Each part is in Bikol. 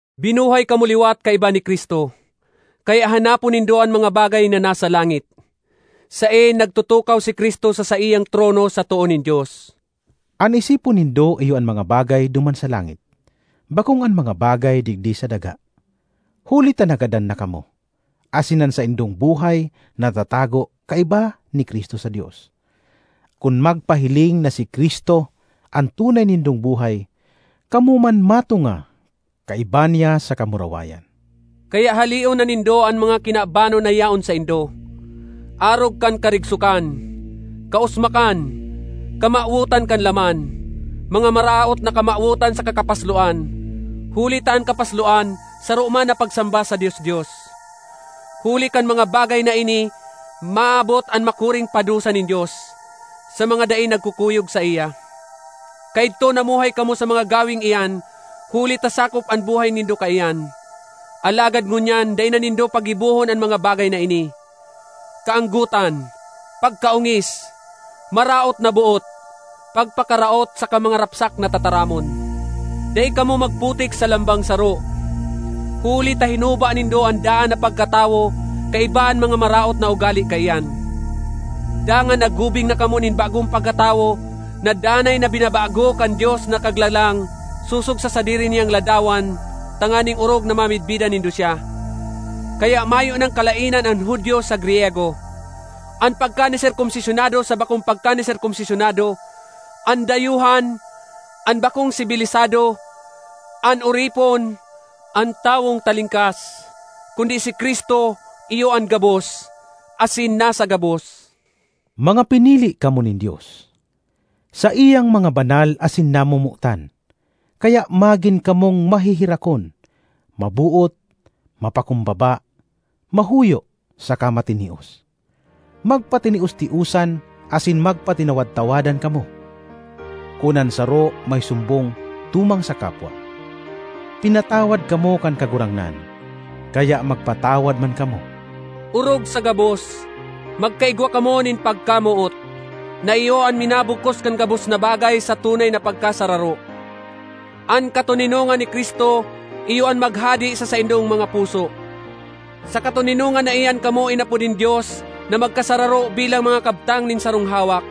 Binuhay kamo liwat kaiba ni Cristo, kaya hanapon nindo an mga bagay na nasa langit, saen nagtutukaw si Cristo sa saiyang trono sa too nin Dios. An isipon nindo iyo an mga bagay duman sa langit, bakong an mga bagay digdi sa daga. Huli ta nagadan na kamo, asin an saindong buhay natatago kaiba ni Cristo sa Dios. Kun magpahiling na si Cristo, an tunay nindong buhay, kamo man matunga kaiba niya sa kamurawayan! Kaya haleon na nindo an mga kinabanon na yaon saindo, arog kan karigsokan, kausmakan, kamawotan kan laman, mga maraot na kamawotan saka kapasloan (huli ta an kapasloan saro man na pagsamba sa dios-dios). Huli kan mga bagay na ini maabot an makuring padusa nin Dios (sa mga dai nagkukuyog saiya). Kaidto namuhay kamo sa mga gaweng iyan huli ta sakop an buhay nindo kaiyan. Alagad ngunyan dai na nindo paggibohon an mga bagay na ini: kaanggotan, pagkaongis, maraot na boot, pagpakaraot saka mga rapsak na tataramon. Dai kamo magputik sa lambang saro, huli ta hinuba nindo an daan na pagkatawo kaiba an mga maraot na ugale kaiyan, dangan naggubing na kamo nin bagong pagkatawo na danay na binabago kan Dios na Kaglalang sosog sa sadiri niyang ladawan tanganing orog na mamidbidan nindo siya. Kaya mayo nang kalaenan an Judio sa Griyego, an pagkaniserkomsisyonado sa bakong pagkaniserkomsisyonado, an dayuhan, an bakong sibilisado, an oripon, an tawong talingkas, kundi si Cristo iyo an gabos, asin nasa gabos. Mga pinili kamo nin Dios; saiyang mga banal asin namomotan. Kaya magin kamong maheherakon, maboot, mapakumbaba, mahuyo, saka matinios. Magpatinios-tiosan asin magpatinawad-tawadan kamo, kun an saro may sumbong tumang sa kapwa. Pinatawad kamo kan Kagurangnan, kaya magpatawad man kamo. Orog sa gabos, magkaigwa kamo nin pagkamoot, na iyo an minabugkos kan gabos na bagay sa tunay na pagkasararo. An katoninongan ni Cristo iyo an maghade sa saindong mga puso; sa katoninongan na iyan kamo inapod nin Dios na magkasararo bilang mga kabtang nin sarong hawak.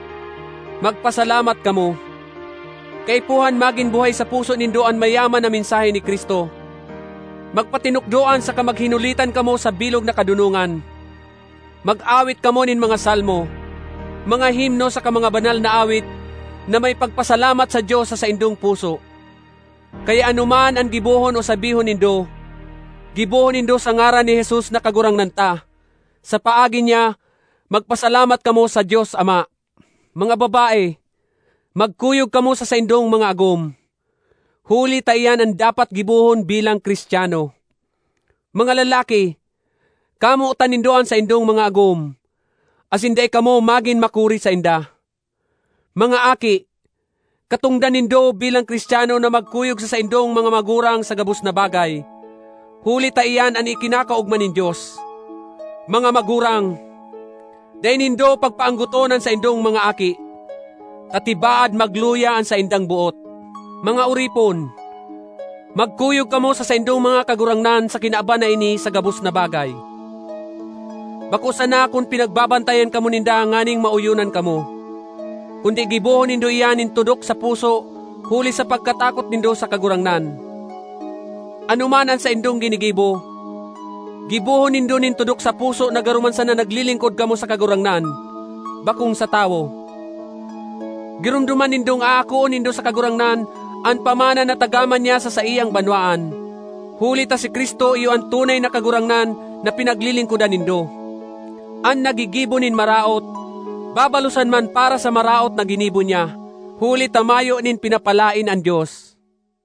Magpasalamat kamo. Kaipuhan magin buhay sa puso nindo an mayaman na mensahe ni Cristo. Magpatinukdoan saka maghinulitan kamo sa bilog na kadonongan. Mag-awit kamo nin mga salmo, mga himno saka mga banal na awit na may pagpasalamat sa Dios sa saindong puso. Kaya anoman an gibohon o sabihon nindo, gibohon nindo sa ngaran ni Jesus na Kagurangnan ta; sa paagi niya magpasalamat kamo sa Dios Ama. Mga babae, magkuyog kamo sa saindong mga agom, huli ta iyan an dapat gibohon bilang Cristiano. Mga lalaki, kamotan nindo an saindong mga agom, asin dai kamo magin makuri sainda. Mga aki, katongdan nindo bilang Cristiano na magkuyog sa saindong mga magurang sa gabos na bagay, huli ta iyan an ikinakaogma nin Dios. Mga magurang, dai nindo pagpaanggoton an saindong mga aki, ta tibaad magluya an saindang boot. Mga oripon, magkuyog kamo sa saindong mga kagurangnan sa kinaban na ini sa gabos na bagay, bako sana kun pinagbabantayan kamo ninda nganing maoyonan kamo, kundi gibohon nindo iyan nin tudok sa puso huli sa pagkatakot nindo sa Kagurangnan. Anoman an saindong ginigibo, gibohon nindo nin tudok sa puso na garo man sana naglilingkod kamo sa Kagurangnan, bakong sa tawo. Giromdoman nindong aakoon nindo sa Kagurangnan an pamana na tagama niya sa saiyang banwaan. Huli ta si Cristo iyo an tunay na Kagurangnan na pinaglilingkodan nindo. An naggigibo nin maraot babalosan man para sa maraot na ginibo niya, huli ta mayo nin pinapalaen an Dios.